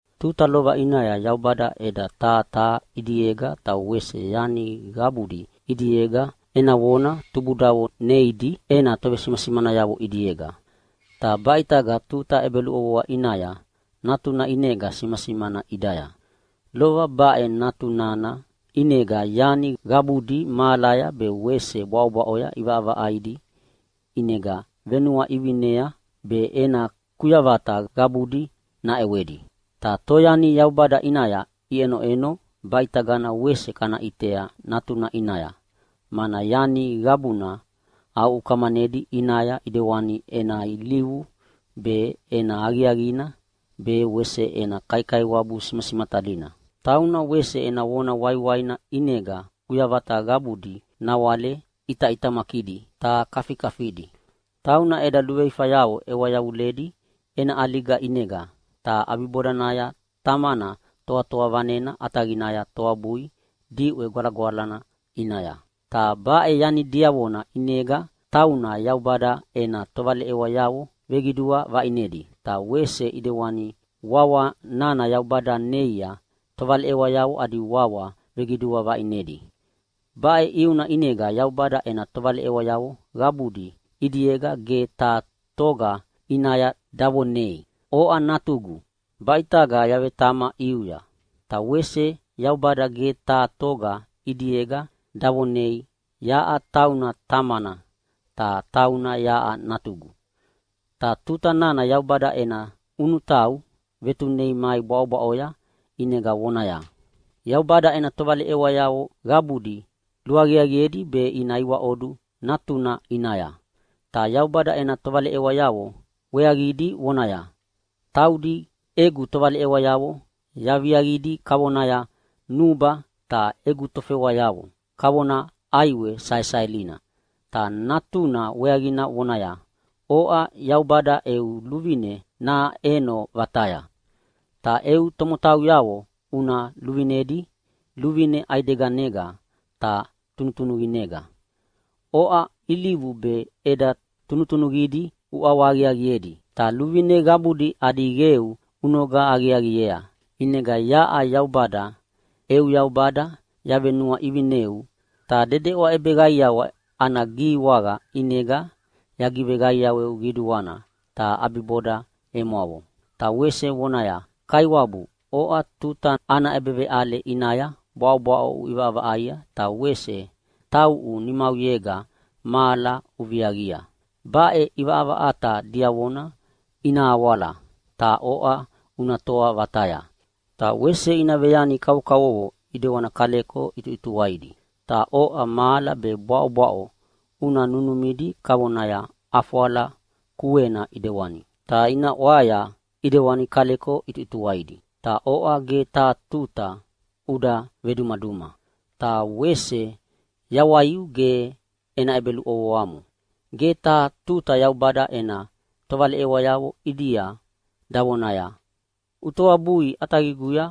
Tuta lova ʼinaya Yaubada ʼeda taha taha ʼidiega ta wese yani qabudi ʼidiega ena vona tubudavo neidi ena tovesimasimanayavo ʼidiega. Ta baʼitaga tuta ʼebeluʼovoa ʼinaya Natuna ʼinega simasimana ʼidaya. Lova baʼe Natuna nana ʼinega yani qabudi mahalaya be wese bwaʼobwaʼoya ʼivaʼavaʼaidi, ʼinega venuaʼivinea be ena kuyavata qabudi naʼewedi. Ta toyani Yaubada ʼinaya iʼenoʼeno baʼitagana wese kana ʼitea Natuna ʼinaya, mana yani qabuna aʼukamanedi ʼinaya ʼidewani ena ilivu be, ena aqiaqina be wese ena kaikaiwabu simasimatalina. Tauna wese ena vona waiwaina ʼinega kuyavata qabudi nawale ʼitaʼitamakidi ta kafikafidi. Tauna eda luveifanayavo ʼewa yavuledi ena ʼaliga ʼinega, ta ʼabibodanaya Tamana Toatoa Vanena ʼataqinaya toabui diʼwe gwalagwalana ʼinaya. Ta baʼe yani diavona ʼinega tauna Yaubada ena tovaleʼewayavo veqidua vaʼinedi, ta wese ʼidewana wawa nana Yaubada neia tovaleʼewayavo adi wawa veqidua vaʼinedi. Baʼe ʼiuna ʼinega Yaubada ena tovaleʼewayavo qabudi ʼidiega ge taha toga ʼinaya davonei, “Oʼa Natugu, baʼitaga yavetama ʼiuya.” Ta wese Yaubada ge taha toga ʼidiega davonei, “Yaʼa tauna tamana, ta tauna yaʼa natugu.” Ta tuta nana Yaubada ena ʼunutau vetunei mai bwaʼobwaʼoya ʼinega vonaya, “Yaubada ena tovaleʼewayavo qabudi luaqiaqiedi be ina iwaʼodu Natuna ʼinaya.” Ta Yaubada ena tovaleʼewayavo weaqidi vonaya, “Taudi egu tovaleʼewayavo yaviaqidi kavonaya nuba, ta egu tofewayavo kavonaya ʼaiwe saesaelina.” Ta Natuna weaqina vonaya, “Oʼa Yaubada eu luvine naʼeno vataya. Ta eu tomotauyavo una luvinedi luvine ʼaideganega ta tunutunuqinega. Oʼa ilivu be ʼeda tunutunuqidi uʼawahaqiaqiedi, ta luvine qabudi adi qeu unoga aqiaqiea. ʼInega yaʼa Yaubada eu Yaubada yavenuaʼivineu ta dedeʼwa ʼebeqaiawa ana gihiwaqa ʼinega yagiveqaiaweu qiduana, ta ʼabiboda emwavo.” Ta wese vonaya, “Kaiwabu, oʼa tuta ana ʼebeveʼale ʼinaya bwaʼobwaʼo uʼivaʼavaʼaia ta wese tauʼu nimauyega mahala uviaqia. Baʼe ʼivaʼavaʼata diavona ina awala, ta oʼa una toa vataya. Ta wese ina veyani kavokavovo ʼidewani kaleko ʼituʼituwaidi. Ta oʼa mahala be bwaʼobwaʼo una nunumidi kavonaya ʼafwala kuena ʼidewani, ta ina ʼwaya ʼidewani kaleko ʼituʼituwaidi. Ta oʼa ge taha tuta uda vedumaduma, ta wese yawaiu ge ena ʼebeluʼovoamo.” Ge taha tuta Yaubada ena tovaleʼewayavo ʼidia davonaya, “Utoabui ʼataqiguya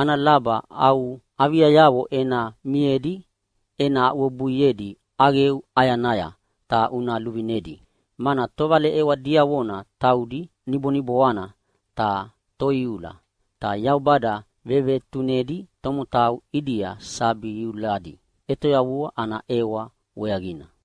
ana laba au aviayavo ena miedi ena aʼuwebuiedi ʼaqeu ʼayanaya ta una luvinedi.” Mana tovaleʼewa diavona taudi niboniboana ta toiula, ta Yaubada vevetunedi tomotau ʼidia sabi iuladi ʼetoyavua ana ʼewa weaqina.